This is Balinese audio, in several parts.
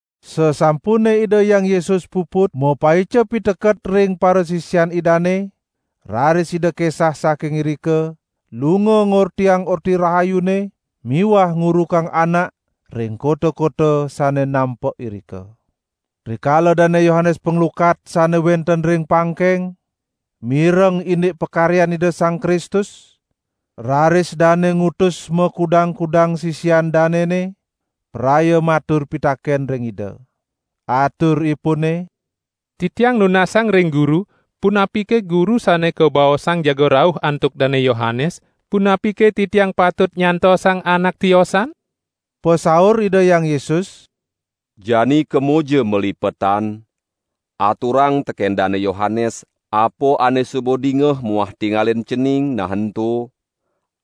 Sasampune Ida Hyang Yesus puput mapaica piteket ring parasisian Idane, raris Ida kesah saking irika lunga ngortiang Orti Rahayune miwah ngurukang anak ring kota-kota sane nampek irika. Rikala Dane Yohanes Panglukat sane wenten ring pangkeng, mireng indik pakaryan Ida Sang Kristus, raris dane ngutus makudang-kudang sisian danene, praya matur pitaken ring Ida. Aturipune: "Titiang nunasang ring Guru, punapike Guru sane kabaosang jaga rauh antuk Dane Yohanes, punapike titiang patut nyantosang anak tiosan?" Pasaur Ida Hyang Yesus: "Jani kemoja malipetan, aturang teken Dane Yohanes, apa ane suba dingeh muah tingalin cening, nah ento: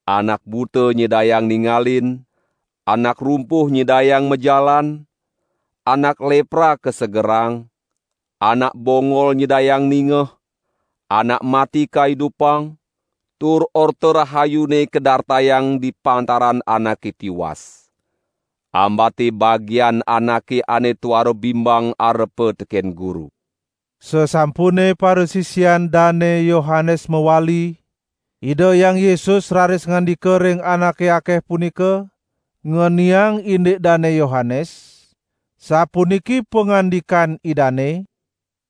Anak buta nyidayang ningalin, anak rumpuh nyidayang majalan, anak lepra kasegerang, anak bongol nyidayang ningeh, anak mati kaidupang, tur Orta Rahayune kadartayang di pantaran anake tiwas. Ambate bagian anake ane tuara bimbang arepa teken Guru." Sasampune parasisian Dane Yohanes mawali, Ida Hyang Yesus raris ngandika ring anake akeh punika ngeniang indik Dane Yohanes; sapuniki pangandikan Idane: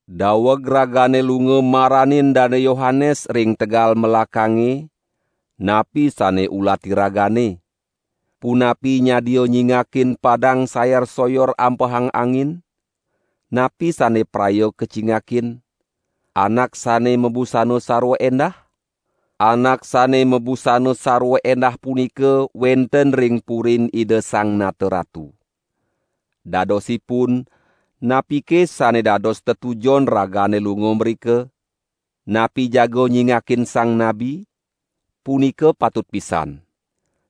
"Daweg ragane lunga maranin Dane Yohanes ring tegal melakange, napi sane ulati ragane? Punapi nyadia nyingakin padang sayar-soyor ampehang angin? Napi sane praya kacingakin? Anak sane mabusana sarwa endah? Anak sane mabusana sarwa endah punika wenten ring purin Ida Sang Nata Ratu. Dadosipun, napike sane dados tetujon ragane lunga mrika? Napi jaga nyingakin sang nabi? Punika patut pisan.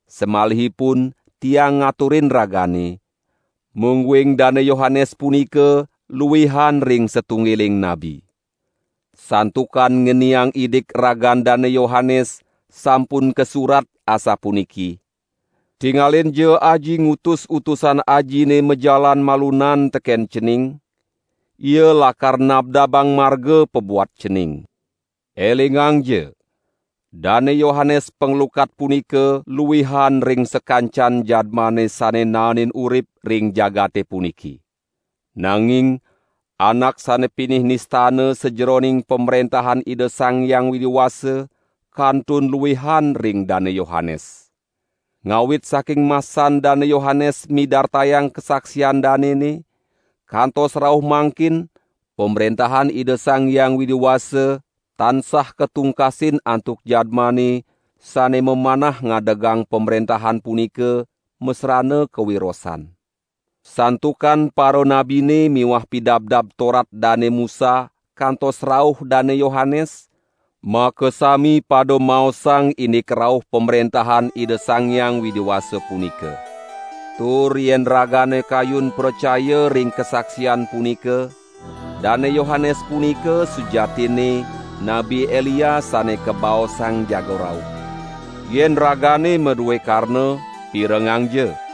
Samalihipun Tiang ngaturin ragane, mungguing Dane Yohanes punika luihan ring satunggiling nabi. Santukan ngeniang indik ragan Dane Yohanes sampun kasurat asapuniki: 'Tingalinja Aji ngutus utusan Ajine majalan malunan teken Cening, ia lakar nabdabang marga pabuat Cening.' Elingangja! Dane Yohanes Panglukat punika luihan ring sakancan jadmane sane naenin urip ring jagate puniki. Nanging anak sane pinih nistana sajeroning Pamrentahan Ida Sang Hyang Widi Wasa, kantun luihan ring Dane Yohanes. Ngawit saking masan Dane Yohanes midartayang kasaksian danene, kantos rauh mangkin, Pamrentahan Ida Sang Hyang Widi Wasa tansah katungkasin antuk jadmane sane mamanah ngadegang pamrentahan punika masrana kawirosan. Santukan paranabine miwah Pidabdab Torat Dane Musa kantos rauh Dane Yohanes, makasami pada maosang indik rauh Pamrentahan Ida Sang Hyang Widi Wasa punika. Tur yen ragane kayun pracaya ring kasaksian punika, Dane Yohanes punika sujatinne Nabi Elia sane kabaosang jaga rauh. Yen ragane madue karna pirengangja!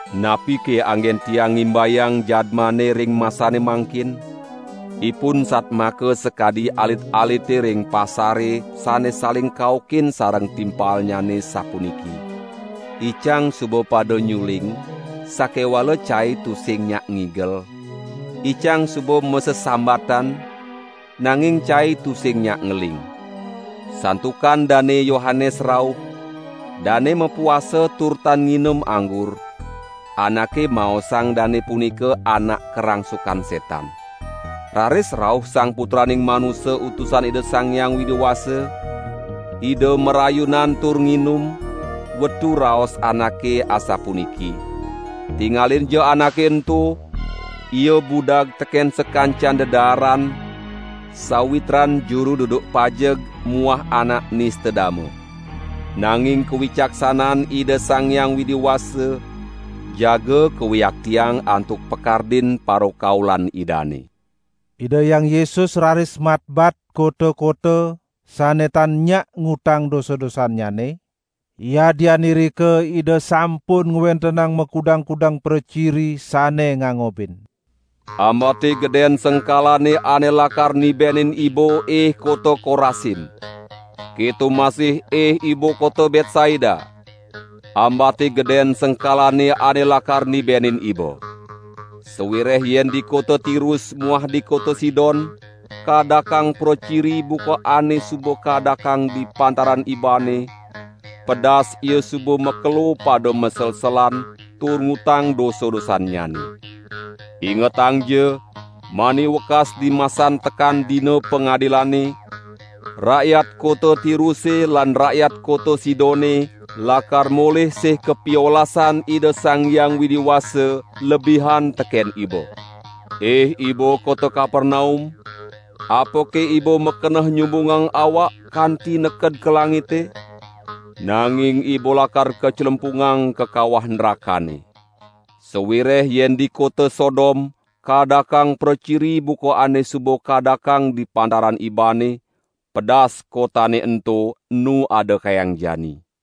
Napike anggen Tiang ngimbayang jadmane ring masane mangkin? Ipun satmaka sakadi alit-alite ring pasare sane saling kaukin sareng timpalnyane sapuniki: 'Icang suba pada nyuling, sakewala cai tusing nyak ngigel, icang suba masesambatan, nanging cai tusing nyak ngeling.' Santukan Dane Yohanes rauh, dane mapuasa tur tan nginum anggur; anake maosang dane punika anak karangsukan setan. Raris rauh Sang Putraning Manusa Utusan Ida Sang Hyang Widi Wasa, Ida marayunan tur nginum, wetu raos anake asapuniki: 'Tingalinja Anake ento, Ia budag teken sakancan dedaaran, sawitran juru duduk pajeg muah anak nista dama.' Nanging kawicaksanan Ida Sang Hyang Widi Wasa jaga kawiaktiang antuk pakardin parakaulan Idane." Ida Hyang Yesus raris matbat kota-kota sane tan nyak ngutang dosa-dosannyane, yadian irika Ida sampun ngwentenang makudang-kudang praciri sane ngangobin. "Ambate geden sengkalane ane lakar nibenin iba ih kota Korasim. Keto masih ih iba kota Betsaida, ambate geden sengkalane ane lakar nibenin iba! Sawireh yen di kota Tirus muah di kota Sidon kaadakang praciri buka ane suba kaadakang di pantaran ibane, pedas ia suba makelo pada maselselan tur ngutang dosa-dosannyane. Ingetangja, mani wekas dimasan tekan Dina Pangadilane, rakyat kota Tiruse lan rakyat kota Sidone lakar molih sih kapiolasan Ida Sang Hyang Widi Wasa lebihan teken iba. Ih iba kota Kapernaum, apake iba makeneh nyumbungang awak kanti neked ka langite? Nanging iba lakar kaclempungang ka kawah nrakane. Sawireh yen di kota Sodom kaadakang praciri buka ane suba kaadakang di pantaran ibane, pedas kotane ento enu ada kayang jani.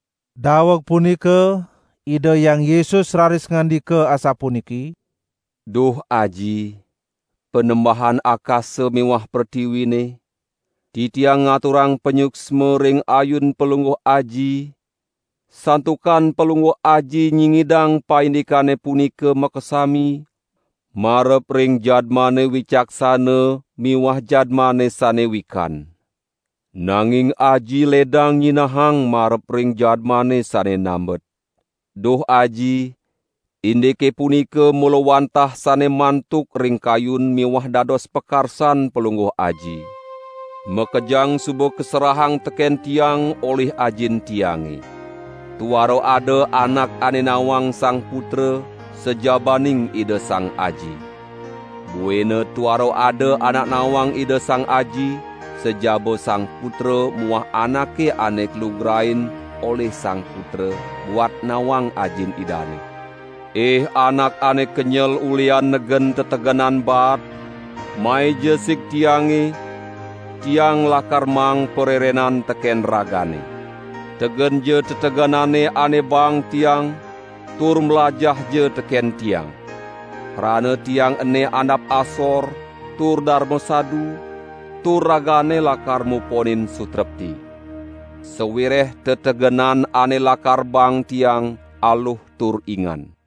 Daweg punika Ida Hyang Yesus raris ngandika asapuniki: "Duh Aji, Panembahan akasa miwah pretiwine, Titiang ngaturang panyuksma ring ayun Palungguh Aji, santukan Palungguh Aji nyingidang paindikane punika makasami marep ring jadmane wicaksana miwah jadmane sane wikan. Nanging Aji ledang nyinahang marep ring jadmane sane nambet. Duh Aji indike punika mula wantah sane mantuk ring kayun miwah dados pakarsan Palungguh Aji. Makejang suba kaserahang teken Tiang olih Ajin Tiange. Tuara ada anak ane nawang Sang Putra sajabaning Ida Sang Aji. Buina tuara ada anak nawang Ida Sang Aji, sajaba Sang Putra muah anake ane kalugrain olih Sang Putra, buat nawang Ajin Idane. Ih anak ane kenyel ulihan negen tetegenan baat, maija sig Tiange, Tiang lakar maang parerenan teken ragane. Tegenja tetegenane ane baang Tiang tur mlajahja teken Tiang. Krana Tiang ene andap asor tur darma sadu, tur ragane lakar muponin sutrepti. Sawireh tetegenan ane lakar baang Tiang aluh tur ingan."